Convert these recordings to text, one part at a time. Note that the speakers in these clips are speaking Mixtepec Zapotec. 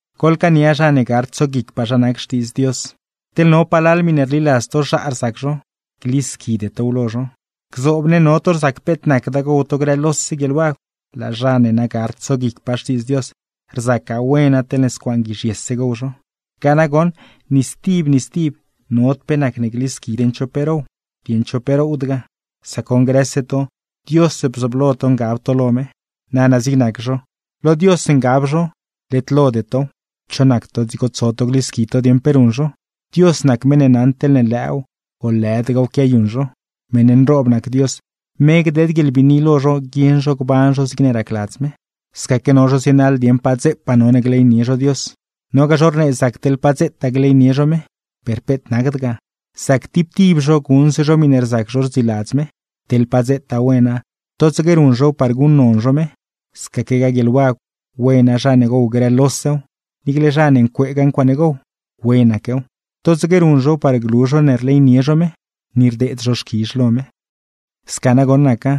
Goḻcaania zha ne gard tsoguicpaa zha nac Xtiidz Dios. Teḻne no palal miṉe rliladz to zhaa rzac zho, glisquide tow lo zho. Gzoob ne, no to rzac peet nacda gow to grë lose guieḻwagw, laa zha ne na gard tsoguicpaa Xtiidz Dios, rzacgaa wena teḻne scuaan guizhyese gow zho; ga nagoṉ, ni stib ni stib nod pe nacne glisqui dieṉ cho pe row, dieṉ cho pe rowdgaa; sac goṉ grëse to, Dios bzooblo to ngab to lo me. Nana zig nac zho, lo Dios ngab zho, led lode tow; ¿cho nac to dzigo tso to glisqui to dieṉ pe ruṉ zho? Dios nac meṉ ne naṉ teḻne lëëw o lëdgaaw ga quiayuṉ zho; meṉ nroob nac Dios, me gdeed guieḻbiini lo zho guieṉ zho gban zho zigne racladz me. Scaque, no zho zienaḻ dieṉ pa dzepaa none gleynie zho Dios, nogaa zho rnee zac teḻ pa dzetaa gleynie zho me. Per peet nacd ga, zac tib tib zho guṉse zho miṉe rzac zho rdziladz me. Teḻ pa dzetaa wena, totsaque ruṉ zhow par guṉnon zho me. Scaquegaa guieḻwagw, wena zha ne gow grëlosew; niicle zha ne ncueegaa ncuaaṉe gow, wenaquew, totsaque ruṉ zhow par glu zho ne rleynie zho me, ni rdeed zho xquizh lo me. Sca nagoṉ naca,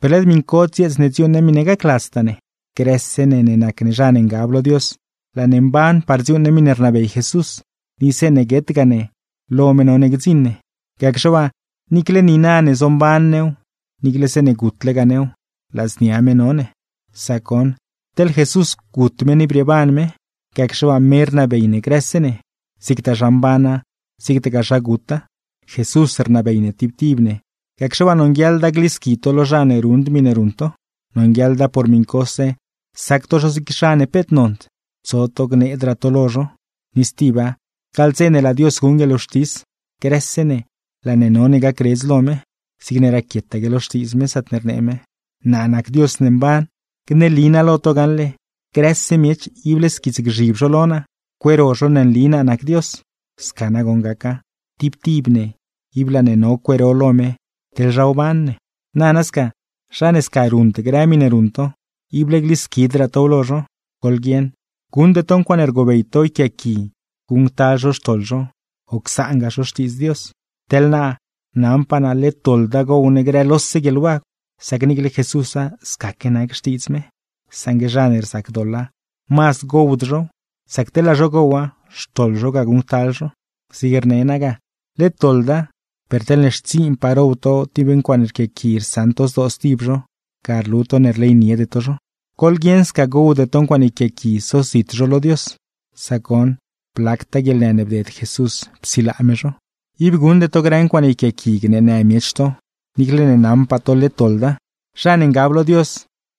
per led miṉ cod dzieets ne dziuuṉ ne miṉe gacladztaa ne. Grëse ne ne nac ne zha ne ngab lo Dios, laa ne mban par dziuuṉ ne miṉe rnabey Jesús, ni zeeṉe guetgaa ne, lo me none gdziṉ ne. Gacxe waa, niicle niina ne zomban new, niicle zeeṉe gutlegaa new, ladznia me no ne. Sac goṉ, teḻ Jesús gut me ni brieeban me; gacxe waa, me rnabey ne grëse ne, zigtaa zha mbana zigtagaa zha guta. Jesús rnabey ne tib tib ne. Gacxe waa, nonguieḻda glisqui to lo zha ne ruṉd miṉe ruṉ to; nonguieḻda por miṉcose sac to zho zig zha ne peet nond, tso to gneedraa to lo zho. Ni stiba, gaḻ dze ne laa Dios guṉ guieḻwxtis, grëse ne laa ne none gacredz lo me. Zigne raquietaque lo Xtiidz me, zaatne rnee me: Naa nac Dios mban, gneli naa lo to gaṉle: grëse miech, ible squiitsgzhib zho lo naa, cueero zho ne nli naa nac Dios. Sca nagoṉ gaca, tib tib ne ib laa ne no cueero lo me teḻ zha wban ne. Nana sca, zha ne sca ruṉd grë miṉe ruṉ to, ible glisquidraa tow lo zho. Goḻguieṉ, guṉde to ncuaaṉe rgobey to yquiaaqui guṉctal zho xtoḻ zho, o csaangaa zho Xtiidz Dios. Teḻ naa, naṉpaa naa led doḻda gow ne grë lose guieḻwagw; sac niicle Jesúsa scaque nac xtiidz me. Saṉgue zha ne rzac doḻa, mazd gowd zhow; sac teḻ laa zho gowa, xtoḻ zho ga guṉctal zho. Zig rne naa ga led doḻda, per teḻne xtsiinpaa row to tib ncuaaṉe rquiaqui rsaṉ to zdoo stib zho, ga rlu to ne rleyniede to zho. ¡Goḻguieṉ sca, gowde to ncuaaṉe yquiaaqui sozit zho lo Dios! Sac goṉ, blactaa guieḻnë ne bded Jesús psilaa me zho. Ib guṉde to grë ncuaaṉe yquiaaqui gneenë miech to, niicle ne naṉpaa to led doḻda. Zha ne ngab lo Dios,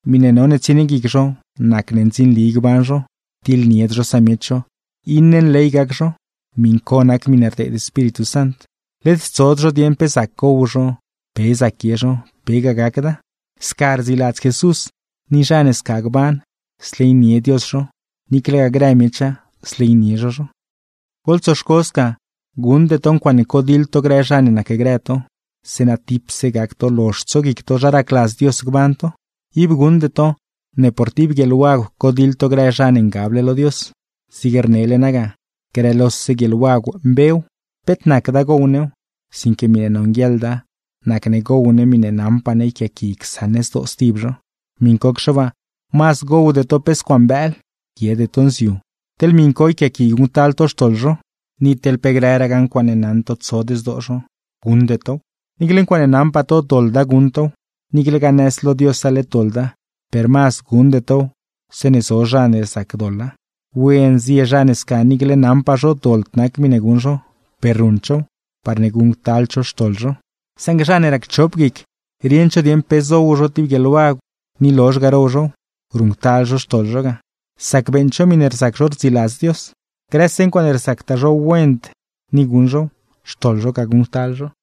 miṉe none tsienie guic zho nac ne ndzinli gban zho, tiḻnied zho samiech zho, iṉe nley gac zho (miṉ co nac miṉe rdeed Espíritu Sant); led tsod zho dieṉ pe zac gow zho, pe zac guie zho, pegaa gacda. Sca rdziladz Jesús, ni zha ne sca gban, zleynie Dios zho, niiclegaa grë miecha zleynie zho zho. Goḻtsoxco sca, guṉde to ncuaaṉe codiḻ to grë zha ne nacgrë to; zeeṉa tipse gac to lozh tsoguic to zha racladz Dios gban to. Ib guṉde to, ne por tib guieḻwagw codiḻ to grë zha ne ngable lo Dios. Zig rnele naa ga, grëlose guieḻwagw mbew, peet nacda gow new; sinque miṉe nonguieḻda, nacne gow ne miṉe naṉpaa ne yquiaaqui csaṉ ne zdoo stib zho. Miṉcocxe waa, mazd gowde to pe scuaan bëël, guiede to nziu, teḻne miṉ co yquiaaqui guṉctal to xtoḻ zho; ni teḻ pe grëraa ncuaaṉe naṉ to tsod zdoo zho, guṉde tow. Niicle ncuaaṉe naṉpaa to doḻda guṉ tow, niiclegaa nëz lo Diosa led doḻda; per mazd guṉde tow zeeṉe zo zha ne rzac doḻa. ¡Wen zie zha ne sca niicle naṉpaa zho doḻd nac miṉe guṉ zho, per ruṉd zhow, parne guṉctald zho xtoḻ zho! Saṉgue zha ne racchop guic rieṉd zho dieṉ pe zow zho tib guieḻwagw, ni lozh ga row zhow, ruṉctal zho xtoḻ zho ga; sac beeṉd zho miṉe rzac zho rdziladz Dios. Grëse ncuaaṉe rzactaa zho wend ni guṉ zhow, xtoḻ zho ga guṉctal zho.